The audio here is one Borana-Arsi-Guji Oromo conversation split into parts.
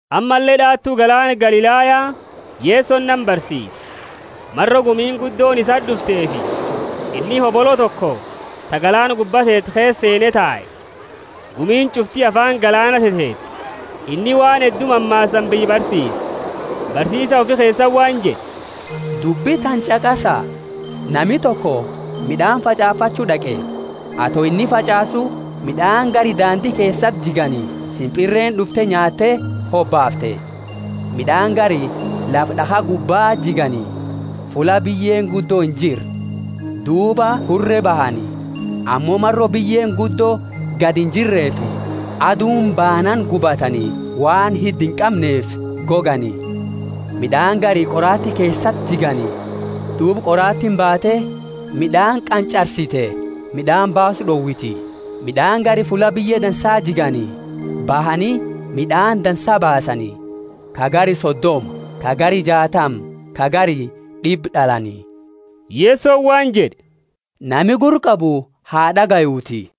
Ammalle d'aatu galaana Galilaya Yesoni nama barsiise. Maro gumiini guddooni isati d'ufteefi, inni hobolo toko ta galaana gubba teetu keesa seene tae. Gumiini ch'ufti afaani galaana teteete. Inni waan heddu mammaasaani biyya barsiise, barsiisa ufi keesati waan jed'e, Dubbi tana ch'aqasa! Nami toko mid'aani fach'aafachu d'aqe. Ato inni fach'aasu, mid'aani gari dandi keesati jigani, simpirreeni d'ufte nyaatte hobaafte. Mid'aani gari lafa d'akha gubbaa jigani, fulla biyyeeni guddo injirre; duuba hure bahani, ammo maro biyyeeni guddo gadi injirrefi, aduuni baanaani gubatani, waan hidda inqamneefi gogani. Mid'aani gari qoraati keesati jigani. Duuba qoraatiini baate, mid'aani qanch'arsite, mid'aani baasu d'owiti. Mid'aani gari fulla biyye dansa jigani, bahani, mid'aani dansa baasani, ka gari sodoma, ka gari jaatama, ka gari d'ibba d'alani. Yesoni waan jed'e, Nami gurra qabu ha d'agayuuti.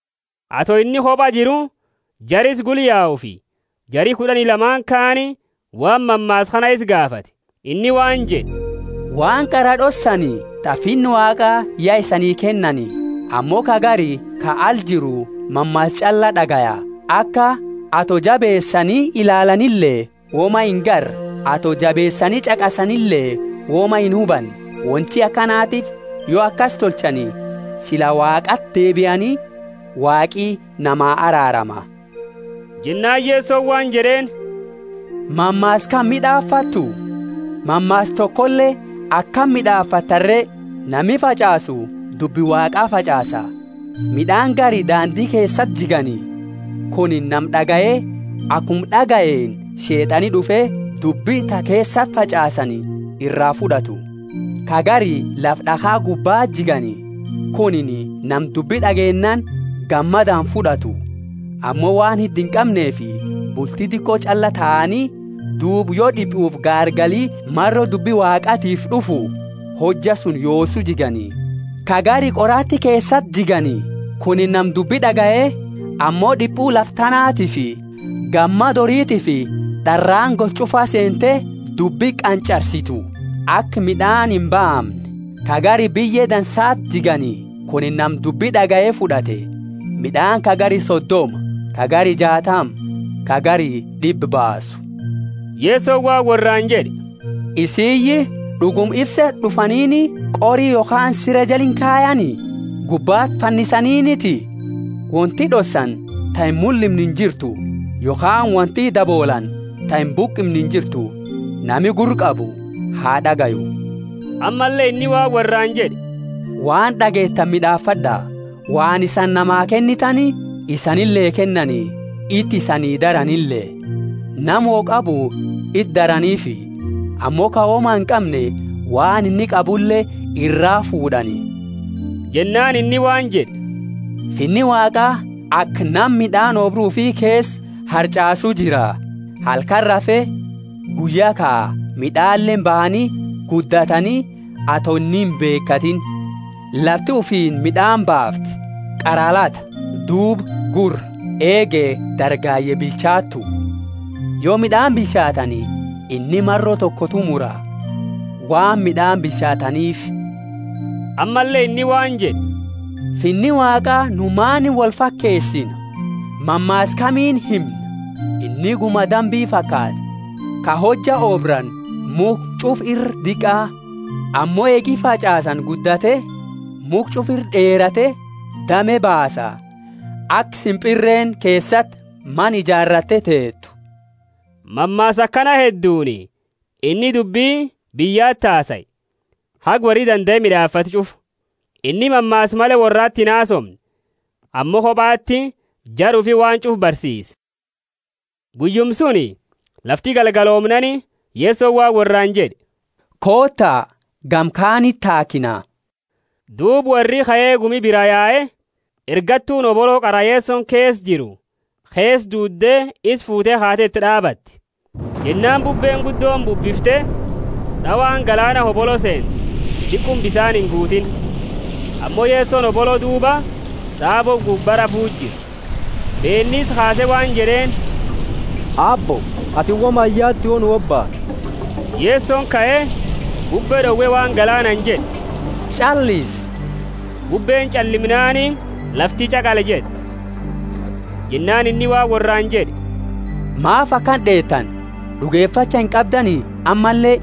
Ato inni koba jiru, jara isa gula yaufi jari kud'ani lamaani kaani waan mammaasa kana isa gaafate. Inni waan jed'e, Waan qara d'ossani ta Finna Waaqa ya isani kennani; ammo ka gari ka ala jiru mammaasa ch'alla d'agaya, aka, Ato jabeesani ilaalanile woma inagarre, ato jabeesani ch'aqasanile woma inhubanne; wonti akanatiifi, yo akasi tolchani, sila Waaqaati deebiani, Waaqi nama araarama. Jennaani Yesoni waan jed'eeni, Mammaasa kana mid'aafattu? Mammaasa tokole akami mid'aafattani re? Nami fach'aasu dubbi Waaqa fach'aasa. Mid'aani gari dandi keesati jigani. Kunini nama d'agaye, akuma d'agayeeni Sheet'ani d'ufe, dubbi ta keesati fach'aasani iraa fud'atu. Ka gari lafa d'akha gubbaa jigani. Kunini nama dubbi d'ageennaani gammadaani fud'atu. Ammo waan hidda inqamneefi, bulti diqo ch'alla taani; duuba yo d'ipufi gaargali maro dubbi Waaqatiifi d'ufu, hojja suni yoosu jigani. Ka gari qoraati keesati jigani. Kunini nama dubbi d'agaye, ammo d'ipu lafa tanaatiifi gammada horitiifi d'araani gosa ch'ufaa seente, dubbi qanch'arsitu, aka mid'aani imbaamne. Ka gari biyye dansati jigani. Kunini nama dubbi d'agaye fud'ate, mid'aani ka gari sodoma, ka gari jaatama, ka gari d'ibba baasu. Yesoni waan worraani jed'e, Isiyii, d'uguma ifse d'ufaniini qori yokhaani sire jala inkayani? Gubbati fannisaniiniti? Wonti d'ossani ta imullimne injirtu, yokhaani wonti daboolaani ta imbuqimne injirtu. Nami gurra qabu ha d'agayu. Ammalle inni waan worraani jed'e, Waan d'ageetani mid'aafad'a! Waan isani namaa kennitani isanile kennani, iti isani daranile. Nama wo qabu iti daraniifi, ammo ka woma inqamne waan inni qabule iraa fuud'ani. Jennaani inni waan jed'e, Finni Waaqa aka nama mid'aani oobru ufi keesa harch'aasu jira. Halkani rafe, guyya kaa, mid'aleeni bahani guddatani, ato inni imbeekatiini. Lafti ufiini mid'aani baafti, qara lata, duuba gurra, eege dargaye bilchaattu. Yo mid'aani bilchaatani, inni maro tokotu mura, waan mid'aani bilchaataniifi. Ammalle inni waan jed'e, Finni Waaqa nu maani wolfakeesina? Mammaasa kamiini himna? Inni guma dambi fakaata, ka hojja oobrani mukha ch'ufa ira diqa. Ammo eegi fach'aasani guddate, mukha ch'ufa ira d'eerate, dame baasa, aka simpirreeni keesati mana ijaaratte teetu. Mammaasa akana hedduuni inni dubbi biyyati hasae, haga worri dandae mid'aafatu ch'ufa. Inni mammaasa male worrati inhasoomne; ammo kobati jara ufi waan ch'ufa barsiise. Guyyuma suni, lafti galgaloomnaani, Yesoni waan worraani jed'e, Koota, gama kaaniti taakina. Duuba worri kae gumi bira yae, ergattuuni hobolo qara Yesoni keesa jiru keesa duudde isa fuute kaate iti d'aabate. Jennaani bubbeeni guddooni bubbifte, d'awaani galaana hobolo seente, diquma bisaani inguutiini. Ammo Yesoni hobolo duuba, saabo gubba rafuu jira. Beenni isa kaase waan jed'eeni, Aabbo, atini woma iyaaltu yo nu hobaanu? Yesoni kae, bubbe d'owe waan galaanaani jed'e, Ch'allisi! Bubbeeni ch'allimnaani lafti ch'aqali jette. Jennaani inni waan worraani jed'e, Maafi akana d'eetani? D'ugefacha inqabdani ammalle?